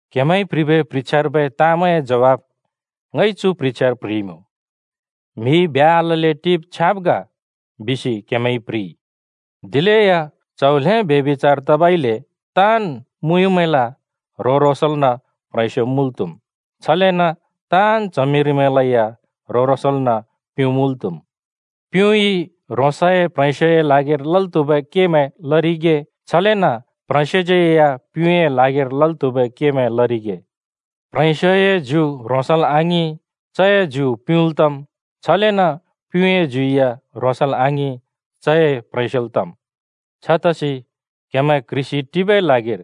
क्‍हेमैंइ प्‍ह्रिबै प्ह्रिछ्यार्बै ताँमैंए ज्वाफ ङइ चु प्ह्रिछ्यार प्‍ह्रिइमुँ। “म्हिइ ब्ह्‍या आलल्‍ले टिब छ्याँब ग” बिसि क्हेमैंइ प्ह्रिइ। दिलेया [ङइ छ बिम्:] च्‍हौ ल्हें ब्यभिचार तबइले ताँन् मुँयुँमैंल ह्रों-ह्रोंसल्न प्ह्रेंस्यो मुँल् त्‍हुम्, छलेन ताँन् च्हमिरिमैंलै या ह्रों-ह्रोंसल्न प्युँ मुल् त्‍हुम्। प्युँइ ह्रोंसए प्ह्रेंस्योए ल्हागिर लल् त्‍हुबै केमैं लरिगे, छलेन प्ह्रेंस्योज्यै या प्युँए ल्हागिर लल् त्‍हुबै केमैं लरिगे। प्ह्रेंस्योए ज्यु ह्रोंसल् आङिं, चए ज्यु प्युँल् तम्। छलेन प्युँए ज्यु या ह्रोंसल् आङिं, चए प्ह्रेंस्योल् तम्। छतसि क्‍हेमैं क्‍ह्रिसि टिबै ल्हागिर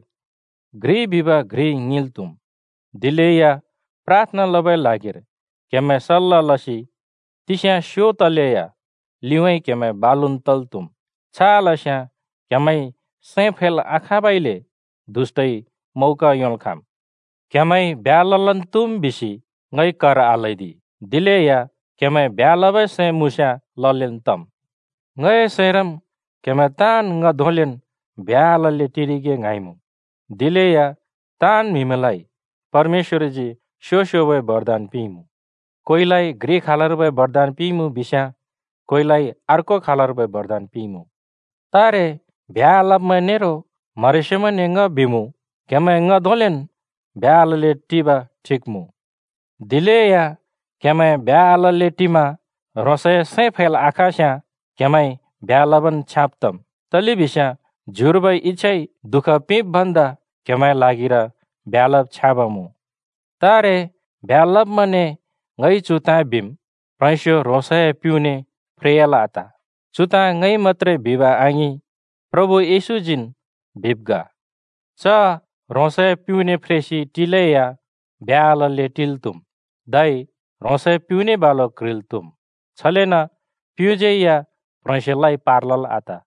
घ्रिइ बिब घ्रिइ ङिंल् त्हुम्। दिलेया प्राथना लबै ल्हागिर क्हेमैं सल्‍ला लसि तिस्या स्यो तलेया लिउँइँ क्‍हेमैं बालुन् तल् त्‍हुम्। छ आलस्याँ क्‍हेमैंइ सैं फैल् आखाँबइले दुष्‍टइ मौका योंल् खाँम्। क्हेमैंइ ब्ह्‍या ललन् त्हुम् बिसि ङइ कर आल्‍हैदि, दिलेया क्हेमैं ब्ह्‍या लबै सैं मुँस्याँ ललेन् तम्। ङए सैंरम् क्‍हेमैं ताँन् ङ धोंलेन् ब्ह्‍या आलल्‍ले टिरिगे ङ्हाँइमुँ। दिलेया ताँन् म्हिलाइ परमेश्‍वरजी स्‍यो-स्‍योबै बरदान पिंइमुँ। कोइलाइ घ्रि खालर्बै बरदान पिंइमुँ बिस्याँ, कोइलाइ अर्कोन् खालर्बै बरदान पिंइमुँ। तारे ब्ह्‍या आलब्‍मैं नेरो म्हरेस्योमैंने ङ बिमुँ: क्‍हेमैं ङ धोंलेन् ब्ह्‍या आलल्‍ले टिब ठिक मुँ। दिलेया क्‍हेमैं ब्ह्‍या आलल्‍ले टिमा ह्रोंसए सैं फैल् आखाँस्‍याँ क्हेमैंइ ब्ह्‍या लबन् छ्याँब् तम्। तलेबिस्याँ ज्युर्बै इच्‍छाइ दुःख पिंब् भन्दा क्हेमैंए ल्हागिर ब्ह्‍या लब छ्याँब मुँ। तारे ब्ह्‍या लब्‍मैंने ङइ चु ताँ बिम्। प्ह्रेंस्यो ह्रोंसए प्युँने फ्रेयाल् आत। चु ताँ ङइ मत्‍त्रे बिब आङिं, प्रभु येशूजीन् बिब् ग। च ह्रोंसए प्युँने फ्रेसि टिलेया ब्ह्‍या आलल्‍ले टिल् त्‍हुम्, धै ह्रोंसए प्युँने बालु क्ह्रिल् त्‍हुम्। छलेन प्युँज्‍यैया प्ह्रेंस्योलाइ पार लल् आत।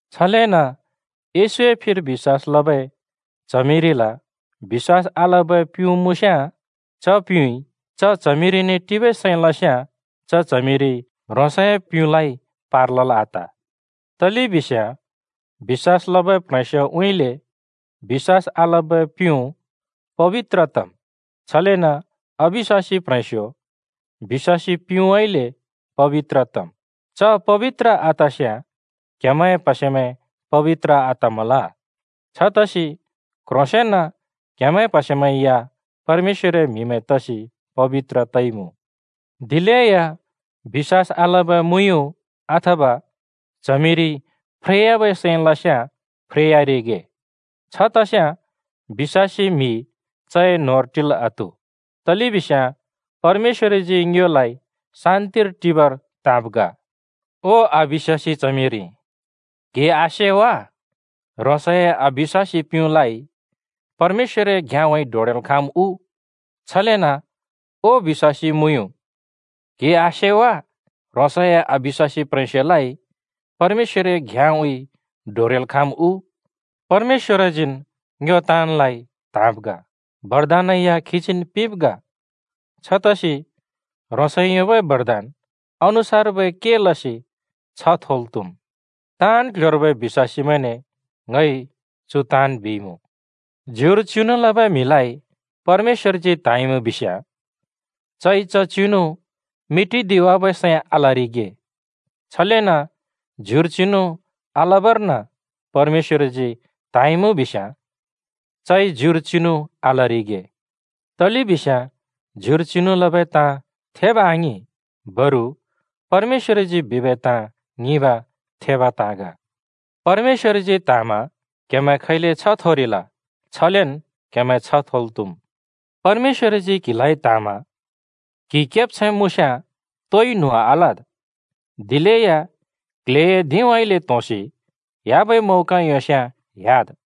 छलेन येशूए फिर बिश्‍वास लबै च्हमिरिल बिश्‍वास आलबै प्युँ मुँस्‍याँ, च प्‍युँइ च च्हमिरिने टिबै सैं लस्‍याँ च च्हमिरिइ ह्रोंसए प्‍युँलाइ पार लल् आत। तलेबिस्याँ बिश्‍वास लबै प्ह्रेंस्योउँइँले बिश्‍वास आलबै प्युँ पबित्र तम्। छलेन अबिश्‍वासी प्ह्रेंस्यो बिश्‍वासी प्‍युँउँइँले पबित्र तम्। च पबित्र आतस्‍याँ क्‍हेमैंए प्‍हसेमैं पबित्र आतमल, छतसि क्ह्रोंसेंन क्‍हेमैंए प्‍हसेमैं या परमेश्‍वरए म्‍हिमैं तसि पबित्र तइमुँ। दिलेया बिश्‍वास आलबै मुँयुँ अथवा च्हमिरिइ फ्रेयाबै सैं लस्‍याँ फ्रेयारिगे। छ तस्याँ बिश्‍वासी म्हि चए न्होंर टिल् आत्हु, तलेबिस्याँ परमेश्‍वरजी ङ्योलाइ शान्तिर टिबर त्‍हाँब् ग। ओ बिश्‍वासी च्हमिरि, क्‍हिइ आसे वा? ह्रोंसए अबिश्‍वासी प्‍युँलाइ परमेश्‍वरए घ्‍याँउँइँ डोरेल् खाँम् उ? छलेन ओ बिश्‍वासी मुँयुँ, क्‍हिइ आसे वा? ह्रोंसए अबिश्‍वासी प्ह्रेंस्योलाइ परमेश्‍वरए घ्‍याँउँइँ डोरेल् खाँम् उ? परमेश्‍वरजीन् ङ्यो ताँनलाइ त्हाँब् ग, बरदानै या खीजीन् पिंब् ग। छतसि ह्रोंसइ योंबै बरदान अनुसार्बै केमैं लसि छ्ह थोल् त्हुम्। ताँन् क्‍ल्‍ह्‍योर्बै बिश्‍वासीमैंने ङइ चु ताँन् बिइमुँ। ज्युर चिनु लबै म्हिलाइ परमेश्‍वरजी त्हाँइमुँ बिस्याँ चइ च चिनु मेटिदिवाबै सैं आलरिगे। छलेन ज्युर चिनु आलबर्न परमेश्‍वरजी त्हाँइमुँ बिस्याँ चइ ज्युर चिनु आलरिगे। तलेबिस्याँ ज्युर चिनु लबै ताँ थेब आङिं। बरु परमेश्‍वरजी बिबै ताँ ङिंब थेबै ताँ ग। परमेश्‍वरजी त्हाँमा क्हेमैं खैले छ्ह थोरिल, छलेन् क्हेमैं थोल् त्हुँम्। परमेश्‍वरजी क्हिलाइ त्हाँमा क्‍हि केब्छैं मुँस्‍याँ तोइ न्हुँ आलद्। दिलेया क्ल्हेए धिंउँइँले त्होंसि ह्‍याबै मौका योंस्‍याँ ह्‍याद्।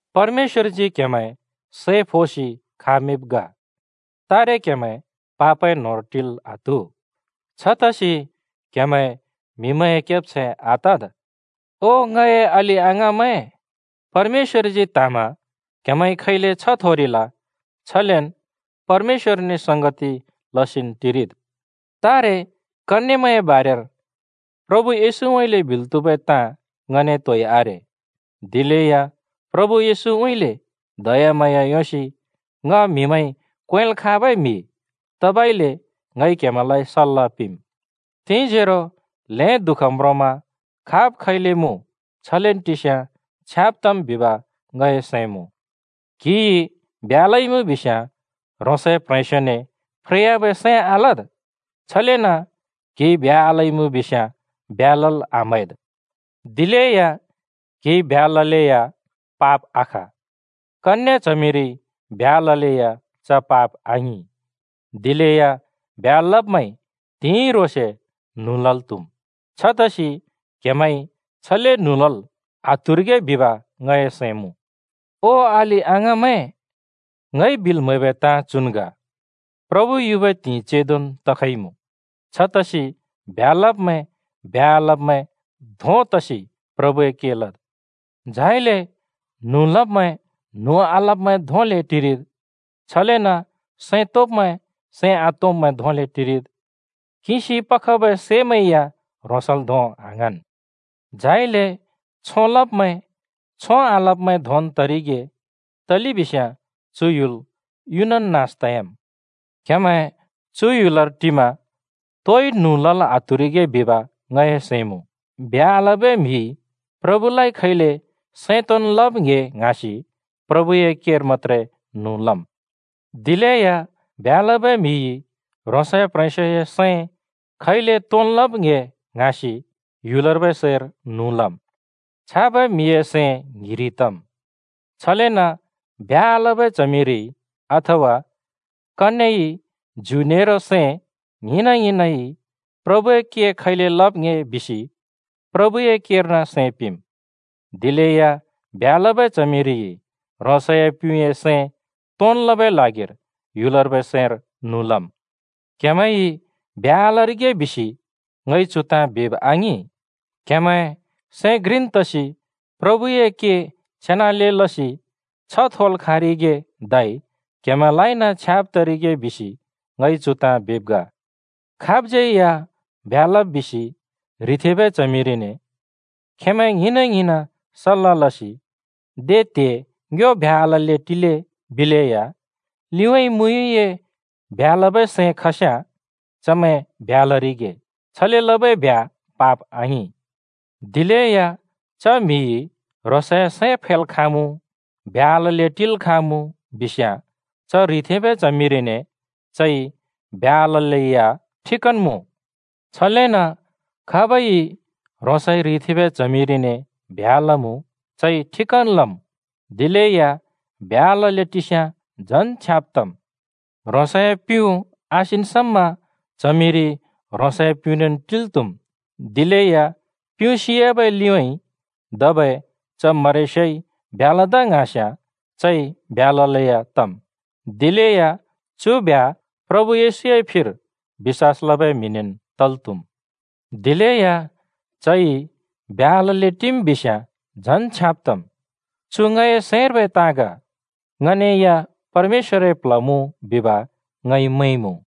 परमेश्‍वरजी क्‍हेमैं सै फोसि खामिंब् ग, तारे क्हेमैं पापए न्होंर टिल् आत्हु। छतसि क्‍हेमैं म्‍हिमैंए केब्छैं आतद्। ओ ङए अलि-अङाँमैं, परमेश्‍वरजी त्हाँमा क्‍हेमैंइ खैले छ्ह थोरिल, छलेन् परमेश्‍वरने संगति लसिन् टिरिद्। तारे कन्‍येमैंए बारेर प्रभु येशूउँइँले बिल् त्‍हुबै ताँ ङने तोइ आरे। दिलेया प्रभु येशूउँइँले दयाम्हाँया योंसि ङ म्हिमैंइ क्वेंल् खाँबै म्हि तबइले ङइ क्‍हेमैंलाइ सल्‍ला पिंम्। तिंजोरो ल्हें दुःख म्रोंमा खाब् खैले मुँ छलेन् टिस्याँ छ्याँब तम् बिब ङए सैं मुँ। क्‍हिइ ब्ह्‍या लइमुँ बिस्याँ ह्रोंसए ह्रेंस्योने फ्रेयाबै सैं आलद्। छलेन क्‍हिइ ब्ह्‍या आलइमुँ बिस्‍याँ ब्ह्‍या लल् आम्हैद्। दिलेया क्‍हिइ ब्ह्‍या ललेया पाप आख, कन्‍ये च्हमिरिइ ब्ह्‍या ललेया च पाप आङिं। दिलेया ब्ह्‍या लब्‍मैंइ त्हिंइ ह्रोंसे न्हुँ लल् त्हुम्। छतसि क्हेमैंइ छले न्हुँ लल् आत्हुरिगे बिब ङए सैं मुँ। ओ अलि-अङाँमैं, ङइ बिल् म्हैबै ताँ चुन् ग: प्रभु युबै त्हिंइ चेंदोन् तखइमुँ। छतसि ब्ह्‍या लब्मैं ब्ह्‍या आलब्‍मैं धों तसि प्रभुए के लद्। झाइले न्हुँ लब्मैं न्हुँ आलब्मैं धोंले टिरिद्। छलेन सैं तोंब्‍मैं सैं आतोंब्मैं धोंले टिरिद्, किंसि पखबै सैमैं या ह्रोंसल् धों आङ्हाँन्। झाइले छों लब्मैं छों आलब्मैं धोंन् तरिगे तलेबिस्याँ चु ह्‍युल युनन् नास तयाम्। क्‍हेमैं चु ह्‍युलर टिमा तोइ न्हुँ लल् आत्हुरिगे बिब ङए सैं मुँ। ब्ह्‍या आलबै म्‍हिइ प्रभुलाइ खैले सैं तोंन् लब् ङ्‍हे ङ्हाँसि प्रभुए केर मत्‍त्रे न्हुँ लम्। दिलेया ब्ह्‍या लबै म्‍हिइ ह्रोंसए प्ह्रेंस्योए सैं खैले तोंन् लब् ङ्‍हे ङ्हाँसि ह्‍युलर्बै सैर न्हुँ लम्। छाबै म्हिए सैं ङ्हिरि तम्। छलेन ब्ह्‍या आलबै च्हमिरिइ अथवा कन्येइ ज्यु नेरो सैं ङ्हिंन-ङ्हिंनइ प्रभुए के खैले लब् ङ्‍हे बिसि प्रभुए केर्न सैं पिंम्। दिलेया ब्ह्‍या लबै च्हमिरिइ ह्रोंसए प्युँए सैं तोंन् लबै ल्हागिर ह्‍युलर्बै सैर न्हुँ लम्। क्‍हेमैंइ ब्ह्‍या आलरिगे बिसि ङइ चु ताँ बिब आङिं। क्हेमैं सैं घ्रिन् तसि प्रभुए के छेनाले लसि छ्ह थोल् खाँरिगे धै क्हेमैंलाइन छ्याँब तरिगे बिसि ङइ चु ताँ बिब् ग। खाबज्यै या ब्ह्‍या लब् बिसि ह्रिथेंबै च्हमिरिने खेंमैं ङ्हिंन् सल्‍ला लसि “दे त्हे ङ्यो ब्ह्‍या आलल्‍ले टिले” बिलेया, लिउँइँ मुँयुँए ब्ह्‍या लबै सैं खस्याँ चमैं ब्ह्‍या लरिगे। छले लबै ब्ह्‍या पाप आङिं। दिलेया च म्हिइ ह्रोंसए सैं फैल् खाँमुँ, ब्ह्‍या आलल्‍ले टिल् खाँमुँ, बिस्याँ च ह्रिथेंबै च्हमिरिने चइ ब्ह्‍या आललै या ठिकन् मुँ। छलेन खाबइ ह्रोंसइ ह्रिथेंबै च्हमिरिने ब्ह्‍या लमुँ, चइ ठिकन् लम्। दिलेया ब्ह्‍या आलल्‍ले टिस्याँ झन् छ्याँब तम्। ह्रोंसए प्युँ आसिन् समा च्हमिरि ह्रोंसए प्‍युँनेन् टिल् त्हुम्। दिलेया प्युँ सियाबै लिउँइँ धबै च म्हरेस्योइ ब्ह्‍या लदा ङ्हाँस्याँ चइ ब्ह्‍या ललेया तम्। दिलेया चु ब्ह्‍या प्रभु येशूए फिर बिश्‍वास लबै म्‍हिनेन् तल् त्हुम्। दिलेया चइ ब्ह्‍या आलल्‍ले टिम् बिस्याँ झन् छ्याँब तम्। चु ङए सैंर्बै ताँ ग, ङने या परमेश्‍वरए प्ल्ह मुँ बिब ङइ मैंमुँ।